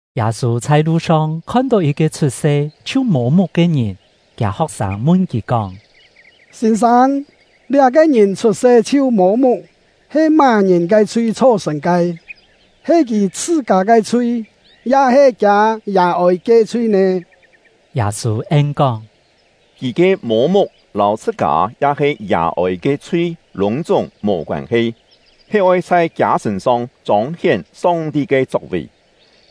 Yâ-sû chhai lu-song khon-tó yit-ke chhut-se chhiu mô-muk ke ngìn. Kiâ ho̍k-sâng mun kì kóng: “Sîn-sâng, liá-ke ngìn chhut-se chhiu mô-muk, he má-ngìn ke chhui chho-sṳ̀n ke? He kì chhṳ-kâ ke chhui, ya-he kiâ yà-ôi ke chhui nè?” Yâ-sû en-kóng: “Kì ke mô-muk lâu chhṳ-kâ ya-he yà-ôi ke chhui lûng-chúng mò koân-he, he oi chhai kiâ sṳ̂n-song chông-hién Song-ti ke chok-vì.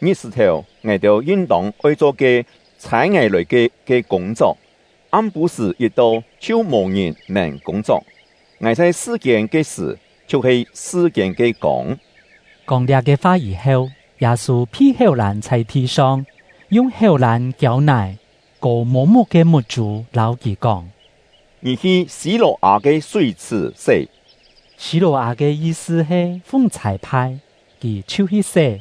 Ngit-sṳ̀-thèu, ngài-têu yin-tông oi cho ke ‘Chhâi ngài lòi ke’ ke kûng-chok; am-pû-sṳ̀ yit-to, chhiu mò-ngìn nèn kûng-chok. Ngài chhai sṳ-kiên ke sṳ̀, chhiu-he sṳ-kiên ke kông.” Kóng liá-ke fa yî-heu, Yâ-sû phi héu-lân chhai thi-song, yung héu-lân kiâu-nài, kò mô-muk ke muk-chû, lâu kì kóng: “Ngì hi Sî-lò-â ke súi-chhṳ̀ sé.” (Sî-lò-â ke yi-sṳ he “Fung chhâi-phai”.) Kì chhiu hi sé,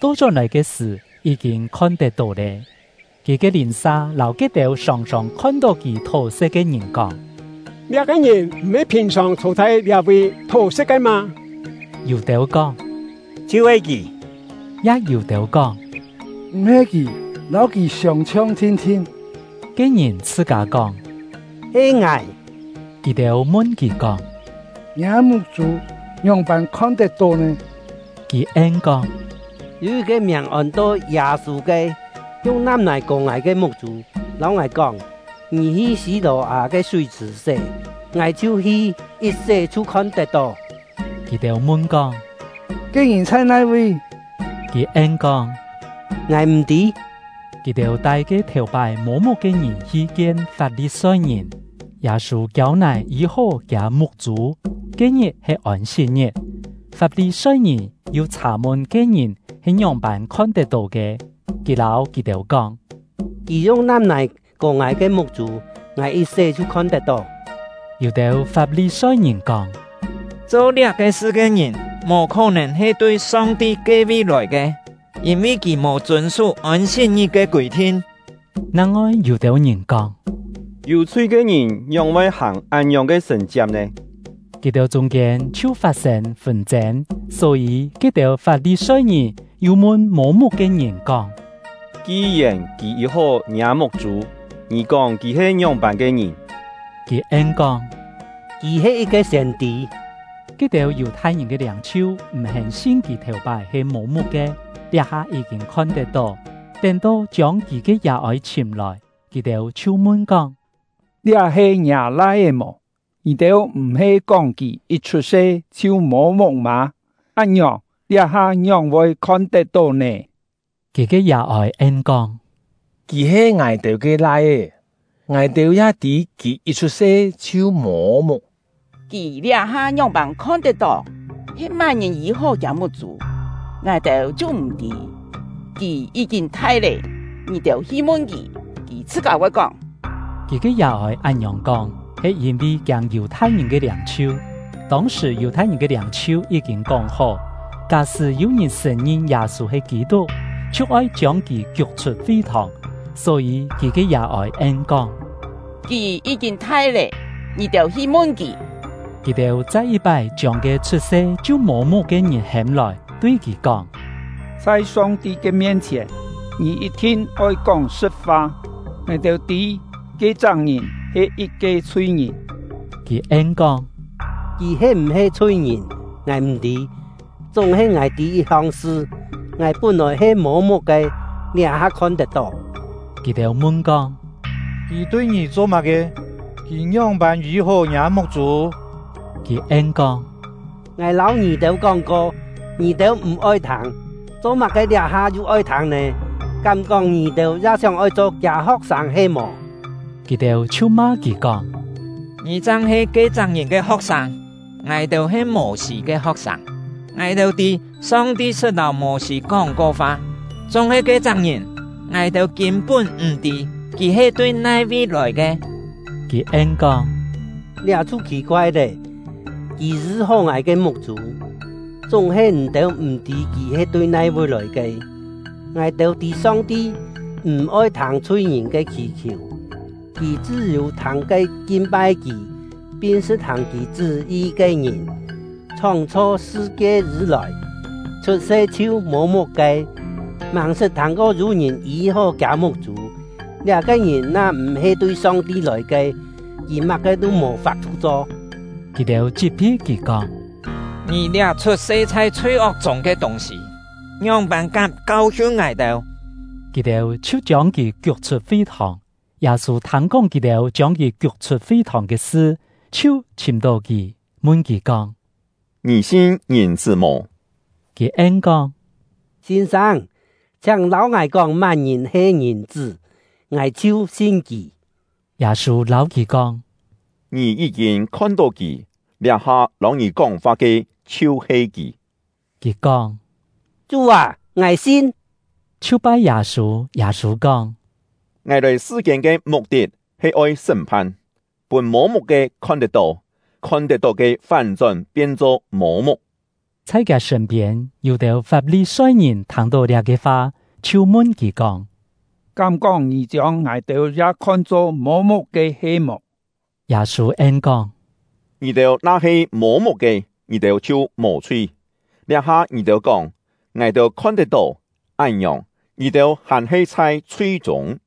to-chón-lòi ke sṳ̀, yí-kîn khon-tet-tó lé. Kì ke lìn-sa lâu ke-têu sòng-sòng khon-tó kì thó-sṳ̍t ke ngìn kóng: “Liá-ke ngìn m̀-he phìn-sòng chhô chhai liá-vi thó-sṳ̍t ke mâ?” Yû-têu kóng: “Chhiu-he kì!” Ya yû-têu kóng: “M̀-he kì, lâu kì siông-chhiong thin-thin.” Ke ngìn chhṳ-kâ kóng: “He ngài.” Kì-têu mun kì kóng: “Ngiâ muk-chû ngióng-pân khon-tet-tó nè?” Kì en-kóng: “Yû yit-ke miàng ôn-to Yâ-sû ke, yung nam-nài kò ngài ke muk-chû, lâu ngài kóng: ‘Ngì hi Sî-lò-â ke súi-chhṳ̀ sé.’ Ngài chhiu hi, yit sé chhiu khon-tet-tó.” Kì-têu mun-kóng: “Ke ngìn chhai nai-vi?” Kì en-kóng: “Ngài m̀ tî.” Kì-têu tai ke thèu-pái mô-muk ke ngìn hi kien Fap-li-soi-ngìn. Yâ-sû kiâu-nài yî-hó kiâ muk-chû, ke-ngit he Ôn-sit-ngit. Fap-li-soi-ngìn yu chhà-mun ke ngìn he ngióng-pân khon-tet-tó ke. Kì lâu kì-têu kóng: “Kì yung nam-nài kò ngài ke muk-chû, ngài yit sé chhiu khon-tet-tó.” Yû-têu Fap-li-soi-ngìn kóng: “Cho liá-ke sṳ ke ngìn mò khó-nèn he tui Song-ti ke-vi lòi ke, yîn-vi kì mò chûn-sú Ôn-sit-ngit ke kûi-thin.” Nang-ngoi yû-têu ngìn kóng: “Yû chhui ke ngìn ngióng-voi hàng án-ngiòng ke sṳ̀n-chiak nè?” Kì-têu chûng-kiên chhiu fat-sên fûn-chên. Só-yî, ke-têu Fap-li-soi-ngìn yu mun mô-muk ke ngìn kóng: “Ki-yèn kì yî-hó ngiâ muk-chû, ngì kóng kì he ngióng-pân ke ngìn?” Kì en-kóng: “Kì he yit-ke siên-tî.” Ke-têu Yù-thai-ngìn ke liâng-chhiu m̀-hén sin kì thèu-pái he mô-muk-ke, liá-ha yí-kîn khon-tet-tó; tén-to chiông kì ke yà-ôi chhìm-lòi, kì-têu chhiu mun-kóng: “Liá he ngiâ lai-é mò? Ngì-têu m̀-he kóng kì yit chhut-se chhiu mô-muk mâ? Án-ngiòng, liá-ha ngióng-voi khon-tet-tó nè?” Kì ke yà-ôi en-kóng: “Kì he ngài-têu ke lai-é, ngài-têu ya tî kì yit chhut-se chhiu mô-muk. Kì liá-ha ngióng-pân khon-tet-tó, he má-ngìn yî-hó kiâ muk-chû, ngài-têu chhiu m̀ tî. Kì yí-kîn thai lé, ngì-têu hi mun kì, kì chhṳ-kâ voi kóng!” Kì ke yà-ôi án-ngiòng kóng, he yîn-vi kiâng Yù-thai-ngìn ke liâng-chhiu; tông-sṳ̀ Yù-thai-ngìn ke liâng-chhiu yí-kîn kóng-hó, ká-sṳ́ yû-ngìn sṳ̀n-ngin Yâ-sû he Kî-tuk, chhiu oi chiông kì kiuk-chhut fi-thòng. Só-yî kì ke yà-ôi en-kóng: “Kì yí-kîn thai lé, ngì-têu hi mun kì!” Kì-têu chai yit-pái chiông ke chhut-se chhiu mô-muk ke ngìn hêm-lòi, tui kì kóng: “Chhai Song-ti ke mien-chhièn, ngì yit-thin oi kóng sṳ̍t-fa! Ngài-têu tî ke-chak ngìn he yit-ke chhui-ngìn.” Kì en-kóng: “Kì he m̀-he chhui-ngìn, ngài m̀ tî; chúng-he ngài tî yit-hong sṳ: Ngài pún-lòi he mô-muk ke, liá-ha khon tet-tó!” Kì-têu mun-kóng: “Kì tui ngì cho má-ke? Kì ngióng-pân yî-hó ngiâ muk-chû?” Kì en-kóng: “Ngài lâu ngì-têu kóng-ko, ngì-têu m̀-oi thâng. Cho-má-ke liá-ha yu oi thâng nè? Kám-kóng ngì-têu ya sióng-oi cho kiâ ho̍k-sâng he-mò?” Kì-têu chhiu ma kì kóng: “Ngì chang he ke-chak ngìn ke ho̍k-sâng! Ngài-têu he Mô-sî ke ho̍k-sâng! Ngài-têu tî Song-ti sṳt lâu Mô-sî kóng-ko fa; chúng-he ke-chak ngìn, ngài-têu kîn-pún m̀ tî kì he tui nai-vi lòi ke!” Kì en-kóng: “Liá chhiu khì-koai lé! Kì yî-hó ngài ke muk-chû, chúng-he ngì-têu m̀ tî kì he tui nai-vi lòi ke! Ngài-têu tî Song-ti m̀-oi thâng chhui-ngìn ke khì-khiù; Kì chṳ́-yû thâng ke kin-pai Kì, pin sṳ̍t-hàng Kì chṳ́-yi ke ngìn. Chhóng-chho sṳ-kie yî-lòi, chhut-se chhiu mô-muk ke, màng-sṳt thâng-ko yû ngìn yî-hó kiâ muk-chû. Liá-ke ngìn na-m̀-he tui Song-ti lòi ke, kì má-ke tû mò fap-thu cho.” Kì-têu chit-phi kì kóng: “Ngì liá chhut-se chhai chhui-ok chûng ke tûng-sî, ngióng-pân kám kau-hiun ngài-têu!” Kì-têu chhiu chiông kì kiuk-chhut fi-thòng. Yâ-sû thâng-kóng kì-têu chiông kì kiuk-chhut fi-thòng ke sṳ, chhiu chhìm-tó kì, mun kì kóng: “Ngì sin Ngìn-chṳ́ mò?” Kì en-kóng: “Sîn-sâng, chhiáng lâu ngài kóng má-ngìn he Ngìn-chṳ́, ngài chhiu sin kì!” Yâ-sû lâu kì kóng: “Ngì yí-kîn khon-tó kì, liá-ha lâu ngì kóng-fa ke chhiu-he kì.” Kì kóng: “Chú â, ngài sin!” chhiu pai Yâ-sû. Yâ-sû kóng: “Ngài lòi sṳ-kiên ke muk-tit he oi sṳ́m-phan, pûn mô-muk-ke khon-tet-tó, khon-tet-tó ke fán-chón pien-cho mô-muk.” Chhai kiâ sṳ̂n-piên, yû-têu Fap-li-soi-ngìn thâng-tó liá-ke fa, chhiu mun kì kóng: “Kám-kóng ngì chiông ngài-têu ya khon-cho mô-muk-ke he-mò?” Yâ-sû en-kóng: “Ngì-têu na-he mô-muk ke, ngì-têu chhiu mò chhui; liá-ha ngì-têu kóng ‘Ngài-têu khon-tet-tó’, án-ngiòng, ngì-têu hàn-he chhai chhui-chûng.”